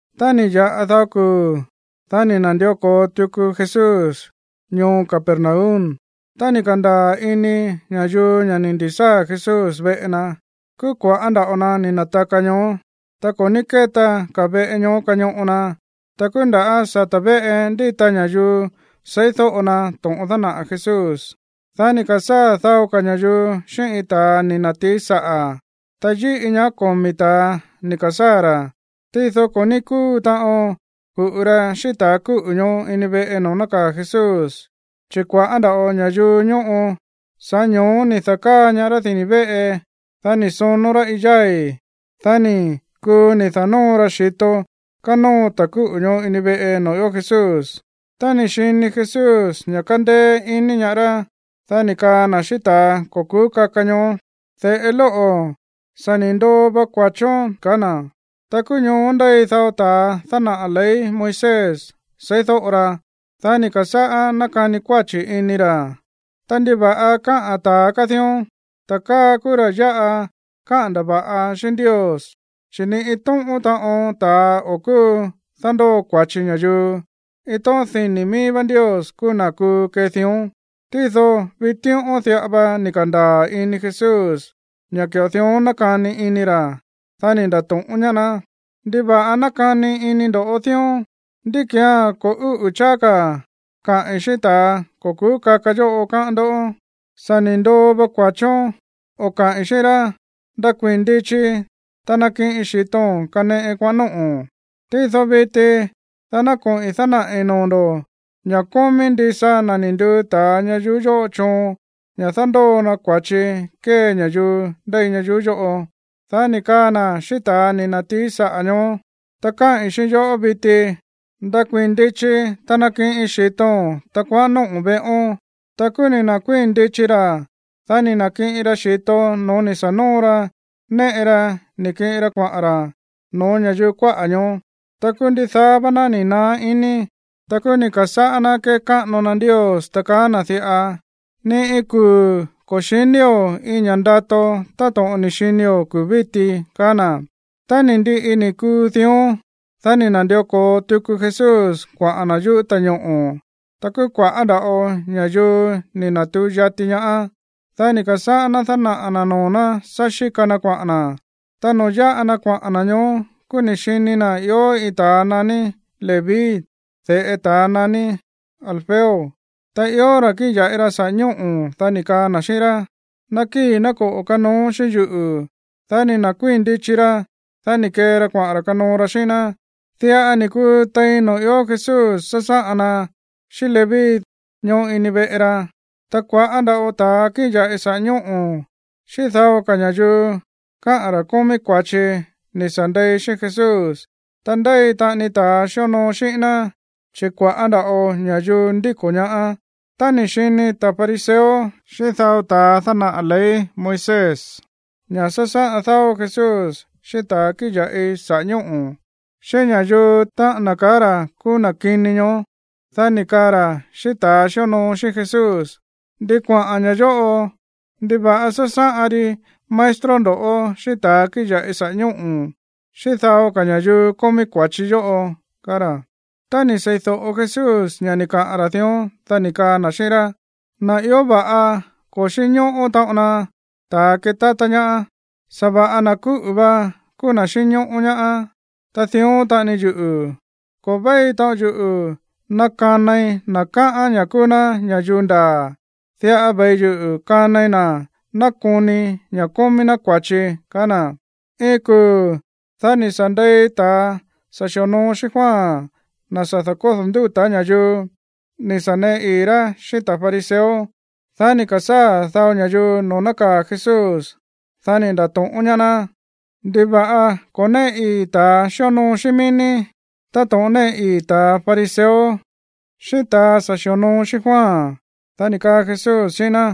Tá ni̱ ya̱ꞌa dao kuu̱, dá ni̱ na̱ndió ko̱o tuku Jesús ñoo Capernaum. Tá ni̱ ka̱ndaa̱ ini ña̱yuu ña̱ ni̱ ndi̱sáa̱ Jesús veꞌe na, kúú kua̱ꞌá nda̱ꞌo na ni̱ na̱taka ñoó. Ta ko̱ ní kéta ka̱ veꞌe ñoó kañoꞌo na. Ta kúú nda̱ sata̱ véꞌe ndíta ña̱yuu seídóꞌo na to̱ꞌon dánaꞌa̱ Jesús. Dá ni̱ ka̱sáa̱ dao ka̱ ña̱yuu xíꞌín iin ta̱a ni̱ na̱tií saꞌa̱, ta yíꞌi ñaá komi̱ ta̱a ni̱ ka̱sáa̱ ra̱. Tído ko̱ ní kúu taꞌon ku̱ꞌu ra xíꞌín ta̱ kúꞌu̱ ñoó ini veꞌe noo̱ nákaa̱ Jesús, chi̱ kua̱ꞌá nda̱ꞌo ña̱yuu ñóꞌo. Sa̱ꞌá ño̱ó ni̱ da̱káa ñaá rá dini̱ véꞌe. Dá ni̱ sonó rá iin yái̱. Dá ni̱ kuu ni̱ da̱nóo ra xi̱to kánóo ta̱ kúꞌu̱ ñoó ini veꞌe noo̱ ió Jesús. Tá ni̱ xini Jesús ña̱ kándéé ini ñaá rá, dá ni̱ kaa na̱ xíꞌín ta̱ ko̱ ku̱ú kaka ñoó: ―De̱ꞌe lóꞌo̱, sa̱ ni̱ ndoo va kua̱chón ―ka̱á na̱. Ta kúú ñoó ndéi dao ta̱a dánaꞌa̱ ley Moisés seídóꞌo ra. Dá ni̱ ka̱sáꞌá nákani kuáchi̱ ini ra̱: “Ta, ¿ndiva̱ꞌa káꞌa̱n ta̱a káa dión? Ta̱a káa kúú ra̱ yáꞌa káꞌa̱n ndava̱ꞌa xíꞌín Ndios. Chi̱ ni iin tóꞌón taꞌon ta̱a o̱ kúu dándóo kua̱chi ña̱yuu. Iin tóꞌón dini̱ mií vá Ndios kúú na̱ kuu kee dión.” Tído vitíꞌón diꞌa va ni̱ ka̱ndaa̱ ini Jesús ña̱ ki̱ꞌo dión nákani ini ra̱. Dá ni̱ nda̱to̱ꞌón ñaá ná: ―¿Ndiva̱ꞌa nákani ini ndo̱ dión? ¿Ndí ki̱án ko̱ úꞌu̱ cháá ka̱ kaꞌi̱n xíꞌín ta̱a ko̱ ku̱ú kaka yóꞌo, káꞌán ndó? “Sa̱ ni̱ ndoo va kua̱chón”, o kaꞌi̱n xíꞌín rá, “Ndakuii̱n ndichi, ta nakiꞌin xi̱to̱n kaneꞌe kuaꞌa̱n nóꞌo̱n.” Tído viti dá ná koꞌi̱n dánaꞌi̱ noo̱ ndo̱ ña̱ kómí ndisa na̱ ni̱ nduu ta̱a ña̱yuu yóꞌo choon ña̱ dándóo na kua̱chi kómí ña̱yuu ndéi ñayuú yóꞌo. Dá ni̱ kaa na̱ xíꞌín ta̱ ni̱ na̱tií saꞌa̱ ñoó: ―Ta káꞌi̱n xíꞌín yo̱ꞌó viti. Ndakuii̱n ndichi, ta nakiꞌin xi̱to̱n, ta kuaꞌán nóꞌo̱n veꞌón. Ta kúú ni̱ na̱kuíi̱n ndichi ra̱. Dá ni̱ na̱kiꞌin ra xi̱to no̱ó ni̱ sa̱ nóo ra néꞌe ra ni̱ kiꞌin ra kuaꞌa̱n ra̱ no̱ó ña̱yuu kuáꞌa̱ ñoó. Ta kúú ndidaá vá ná ni̱ naá iní. Ta kúú ni̱ ka̱sáꞌá ná kékáꞌano na Ndios, ta kaá na̱ diꞌa: ―Ni iin kuu̱ ko̱ xi̱nío̱ iin ña̱ꞌa ndato táto̱ꞌon ni̱ xinio̱ kuu̱ víti ―kaá na̱. Tá ni̱ ndiꞌi ni̱ kuu dión, dá ni̱ na̱ndió ko̱o tuku Jesús kuaꞌa̱n na̱ yuꞌú ta̱ñoꞌo̱. Ta kúú kua̱ꞌá nda̱ꞌo ña̱yuu ni̱ na̱tuu yati ñaá. Dá ni̱ ka̱sáꞌá ná dánaꞌa̱ na̱ noo̱ ná sá xíka na kuaꞌa̱n na̱. Ta noo̱ yáꞌa na kuaꞌa̱n na̱ ñoó, kúú ni̱ xini na̱ ió iin ta̱a naní Leví, de̱ꞌe ta̱ naní Alfeo, ta ió ra̱ kíꞌin ya̱ꞌi ra sa̱ꞌá ñóꞌo̱. Dá ni̱ kaa na̱ xíꞌín rá: ―Nakíi̱, ná koꞌo̱ kanoón xíꞌín yuꞌu̱. Dá ni̱ na̱kuíi̱n ndichi ra̱. Dá ni̱ kee ra kuaꞌa̱n ra̱ kanoo ra xíꞌín ná. Diꞌa ni̱ kuu tein noo̱ ió Jesús sásáꞌan na xíꞌín Leví ñoó ini veꞌe ra. Ta kua̱ꞌá nda̱ꞌo ta̱a kíꞌin ya̱ꞌi sa̱ꞌá ñóꞌo̱ xíꞌín dao ka̱ ña̱yuu kaá ra̱ kómí kua̱chi ni̱ sa̱ ndei xíꞌín Jesús. Ta ndéi taꞌani ta̱a xíonoo xíꞌín ná, chi̱ kua̱ꞌá nda̱ꞌo ña̱yuu ndíko̱ ñaá. Tá ni̱ xini ta̱ fariseo xíꞌín dao ta̱a dánaꞌa̱ ley Moisés ña̱ sásáꞌan dáó Jesús xíꞌín ta̱ kíꞌin ya̱ꞌi sa̱ꞌá ñóꞌo̱, xíꞌín ña̱yuu, táꞌa̱n na̱ kaá ra̱ kúú na̱ kini ñoó, dá ni̱ kaa ra̱ xíꞌín ta̱ xíonoo xíꞌín Jesús: ―¿Ndi kuaꞌa̱n ña̱ yóꞌo? ¿Ndiva̱ꞌa sásáꞌan ri maestro ndo̱ꞌó xíꞌín ta̱ kíꞌin ya̱ꞌi sa̱ꞌá ñóꞌo̱, xíꞌín dao ka̱ ña̱yuu kómí kua̱chi yóꞌo? ―kaá ra̱. Tá ni̱ seídóꞌo Jesús ña̱ ni̱ kaꞌa̱n ra̱ dión, dá ni̱ kaa na̱ xíꞌín rá: ―Na̱ ió va̱ꞌa ko̱ xínñóꞌó taꞌon na ta̱ ketátá ñaá. Sa̱va̱ꞌa na̱ kúꞌu̱ va kúú na̱ xínñóꞌó ñaá. Ta dión taꞌani yuꞌu̱, ko̱ véi taꞌon yuꞌu̱ ná kanai na̱ káꞌán ña̱ kúú ná ña̱yuu ndaa̱. Diꞌa ve̱i yuꞌu̱ kanai na̱ nákoni ña̱ kómí ná kua̱chi ―kaá na̱. Iin kuu̱, dá ni̱ sa̱ ndei ta̱ sa̱ xi̱onoo xíꞌín Juan, na̱ sa̱ da̱kódo̱ ndúta̱ ña̱yuu, ni̱ sa̱ neꞌe ii̱ rá xíꞌín ta̱ fariseo. Dá ni̱ ka̱sáa̱ dao ña̱yuu noo̱ nákaa̱ Jesús. Dá ni̱ nda̱to̱ꞌón ñaá ná: ―¿Ndiva̱ꞌa ko̱ néꞌe ii̱ ta̱ xíonoo xíꞌín mií ní táto̱ꞌon néꞌe ii̱ ta̱ fariseo xíꞌín ta̱ sa̱ xi̱onoo xíꞌín Juan? Dá ni̱ kaa Jesús xíꞌín ná: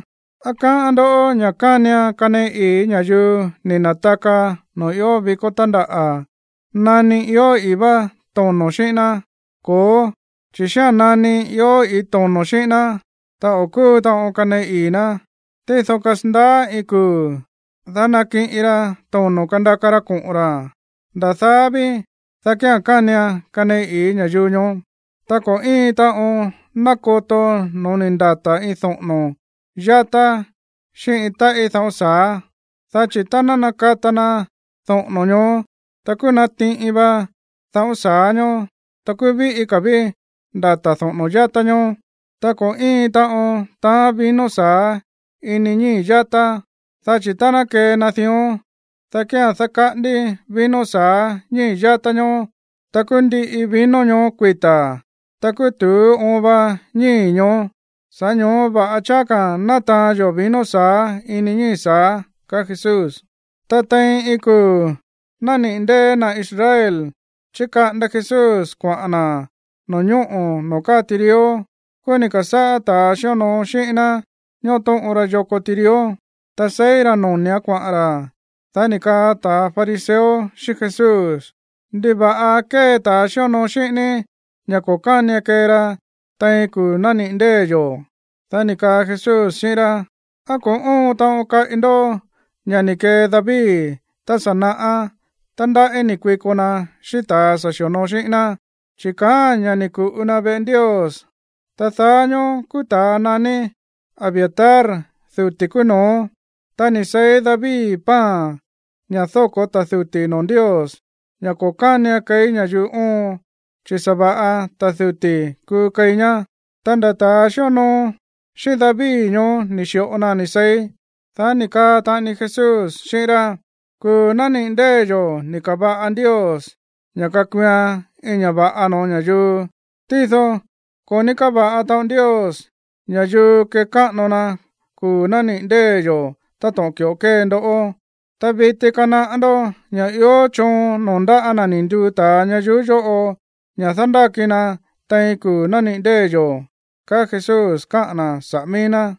―¿Á káꞌán ndó ña̱ kánian kaneꞌe ii̱ ña̱yuu ni̱ na̱taka noo̱ ió vikó tándaꞌa̱ nani ió i̱í vá tono̱ xíꞌín ná? Ko̱ó, chi̱ xía̱n nani ió i̱í tono̱ xíꞌín ná, ta o̱ kúu taꞌon kaneꞌe ii̱ ná. Tído kasandaá iin kuu̱, dá nakiꞌin ra tono̱ kandaka ra koꞌo̱n ra̱. Nda̱ daá ví, dá kía̱n kánian kaneꞌe ii̱ ña̱yuu ñoó. ’Ta ko̱ íin taꞌon nákoto no̱ó ni̱ ndata̱ iin doꞌo̱no̱ yatá xíꞌín iin táꞌí dáꞌo̱n sa̱á. Dá chi̱ tá ná nakata na doꞌo̱no̱ ñoó, ta kúú natiꞌin va dáꞌo̱n sa̱á ñóó, ta kúú víꞌí ka̱ ví ndata̱ doꞌo̱no̱ yatá ñóó. ’Ta ko̱ íin taꞌon taán vino sa̱á ini ñíi̱ yatá. Dá chi̱ tá ná kee na dión, dá kía̱n dákaꞌándí vino sa̱á ñíi̱ yatá ñoó, ta kúú ndiꞌi vino ñoó kuita̱, ta kúú tu̱ú oon va ñíi̱ ñoó. Sa̱ꞌá ño̱ó va̱ꞌa cháá ka̱ ná taán yó vino sa̱á ini ñíi̱ sa̱á ―kaá Jesús. Ta tein iin kuu̱ nániꞌi̱ ndée̱ na̱ Israel, chíkaꞌanda Jesús kuaꞌa̱n na̱ no̱ñóꞌo̱ noo̱ káa tirió. Kúú ni̱ ka̱sáꞌá ta̱ xíonoo xíꞌín ná tóꞌon ra yoko tirió, ta seí ra̱ noni̱án kuaꞌa̱n ra̱. Dá ni̱ kaa ta̱ fariseo xíꞌín Jesús: ―¿Ndiva̱ꞌa kée ta̱ xíonoo xíꞌín ní ña̱ ko̱ kánian kee ra tein kuu̱ nániꞌi̱ ndée̱ yo̱? Dá ni̱ kaa Jesús xíꞌín rá: ―¿Á ko̱ óon taꞌon káꞌi ndoꞌó ña̱ ni̱ kee David tá sa̱ naꞌá tá ndaꞌí ni̱ kuiko na xíꞌín ta̱ sa̱ xi̱onoo xíꞌín ná? Chi̱ kaáa̱n ña̱ ni̱ ku̱ꞌu na veꞌe Ndios. Ta daá ñóó kúú ta̱a naní Abiatar duti̱ kúú no̱ó. Ta ni̱ seí David pan, ña̱ dóko̱ ta̱ duti̱ noo̱ Ndios, ña̱ ko̱ kánian keí ña̱yuu óon, chi̱ sa̱va̱ꞌa ta̱ duti̱ kuu keí ñá. Ta nda̱ ta̱ xíonoo xíꞌín David ñoó ni̱ xi̱ꞌo na ni̱ seí. Dá ni̱ kaa taꞌani Jesús xíꞌín rá: ―Kuu̱ nániꞌi̱ ndée̱ yo̱ ni̱ ka̱va̱ꞌan Ndios ña̱ kakuuan iin ña̱ va̱ꞌa no̱ó ña̱yuu. Tído ko̱ ní káva̱ꞌa taꞌon Ndios ña̱yuu kekáꞌano na kuu̱ nániꞌi̱ ndée̱ yo̱ táto̱ꞌon ki̱ꞌo kée ndoꞌó. Ta viti kanaꞌá ndó ña̱ ió choon noo̱ ndáꞌa̱ na̱ ni̱ nduu ta̱a ñayuú yóꞌo ña̱ dándáki na tein kuu̱ nániꞌi̱ ndée̱ yo̱ ―kaá Jesús káꞌa̱n na̱ saꞌa̱ mií ná.